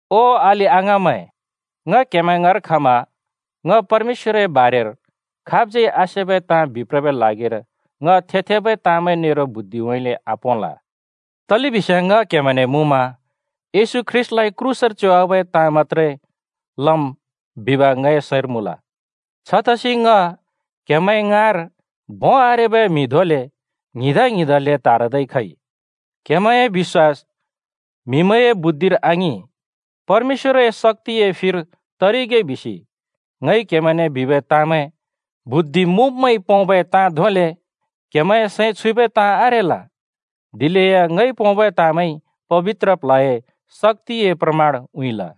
ओ अलि-अङाँमैं, ङ क्‍हेमैं ङाँर खमा ङ परमेश्‍वरए बारेर खाबज्यै आसेबै ताँ बिप्रबै ल्हागिर ङ थे-थेबै ताँमैं नेरो बुद्धिउँइँले आपोंल। तलेबिस्याँ ङ क्‍हेमैंने मुँमा येशू ख्रीष्‍टलाइ क्रूसर च्योवाबै ताँ मत्‍त्रे लम् बिब ङए सैंर मुँल। छतसि ङ क्‍हेमैं ङाँर भों आरेबै म्हि धोंले ङ्हिंदा-ङ्हिंदाले त्हारदै खइ। क्‍हेमैंए बिश्‍वास म्‍हिमैंए बुद्धिर आङिं, परमेश्‍वरए शक्‍तिए फिर तरिगे बिसि ङइ क्हेमैंने बिबै ताँमैं बुद्धि मुँब्मैंइ पोंबै ताँ धोंले क्हेमैंए सैं छुइबै ताँ आरेल। दिलेया ङइ पोंबै ताँमैंइ पबित्र प्ल्हए शक्‍तिए प्रमाण उँइँल।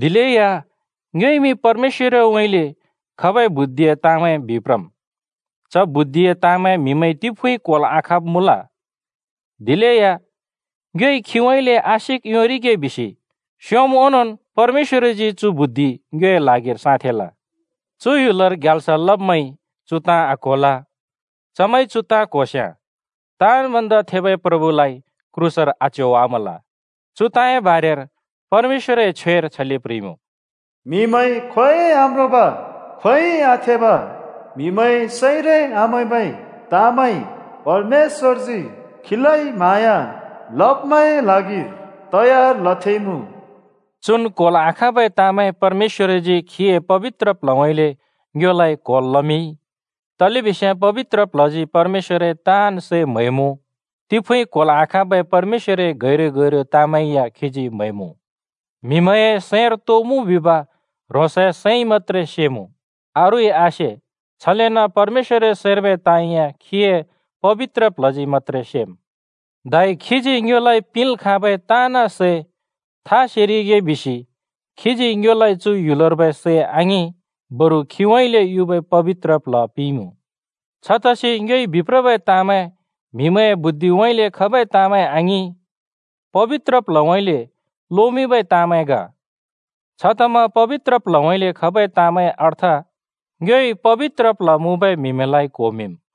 दिलेया ङ्योइमि परमेश्‍वरउँइँले खबै बुद्धिए ताँमैं बिप्रम्। च बुद्धिए ताँ म्हिमैंइ तिफुँइ क्होल् आखाँब् मुँल। दिलेया ङ्योइ खीउँइँले आशिक योंरिगे बिसि स्योंम् ओंनोंन् परमेश्‍वरजी चु बुद्धि ङ्योए ल्हागिर साँथेंल। चु ह्‍युलर ग्याल्स लब्मैंइ चु ताँ आक्होल। चमैंइ चु ताँ क्होस्याँ ताँन् भन्दा थेबै प्रभुलाइ क्रूसर आच्योवामल। चु ताँए बारेर परमेश्‍वरए छ्वेर छले प्ह्रिइमुँ, “म्‍हिमैंइ खोंयोंइ आम्रोंब, खोंयोंइ आथेब, म्हिमैंए सैंरै आमैंबै ताँमैं, परमेश्‍वरजी खीलाइ म्हाँया लब्‍मैंए ल्हागिर तयार लथेंइमुँ।” चुन् क्होल् आखाँबै ताँमैं परमेश्‍वरजी खीए पबित्र प्ल्हउँइँले ङ्योलाइ क्होल् लमिंइ। तलेबिस्याँ पबित्र प्ल्हजी परमेश्‍वरए ताँन् सै म्हैमुँ, तिफुँइ क्होल् आखाँबै परमेश्‍वरए गैरु-गैरु ताँमैं या खीजी म्हैमुँ। म्हिमैंए सैंर तो मुँ बिब ह्रोंसए सैंइ मत्‍त्रे सेमुँ, अरूइ आसे, छलेन परमेश्‍वरए सैंर्बै ताँ या खीए पबित्र प्ल्हजी मत्‍त्रे सेम्। धै खीजी ङ्योलाइ पिंल् खाँबै ताँन् सै था सेरिगे बिसि खीजी ङ्योलाइ चु ह्‍युलर्बै सैं आङिं, बरु खीउँइँले युबै पबित्र प्ल्ह पिंइमुँ। छतसि ङ्योइ बिप्रबै ताँमैं म्‍हिमैंए बुद्धिउँइँले खबै ताँमैं आङिं, पबित्र प्ल्हउँइँले लोमिंबै ताँमैं ग। छतमा पबित्र प्ल्हउँइँले खबै ताँमैंए अर्थ ङ्योइ पबित्र प्ल्ह मुँबै म्हिमैंलाइ क्होमिंम्।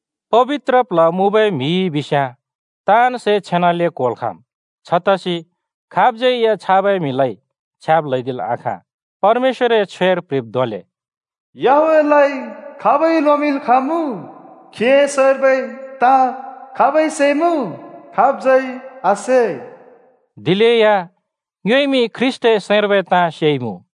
पबित्र प्ल्ह मुँबै म्हि बिस्याँ ताँन् सै छेनाले क्होल् खाँम्, दिलेया खाबज्यै या छाबै म्हिलाइ छ्याब् ल्हैदिल् आखाँ। परमेश्‍वरए छ्वेर प्ह्रिब् धोंले, “याहवेहलाइ खाबइ लोमिंल् खाँमुँ? खीए सैंर्बै ताँ खाबइ सेइमुँ? खाबज्यै आसे।” दिलेया ङ्योइमि ख्रीष्‍टए सैंर्बै ताँ सेइमुँ।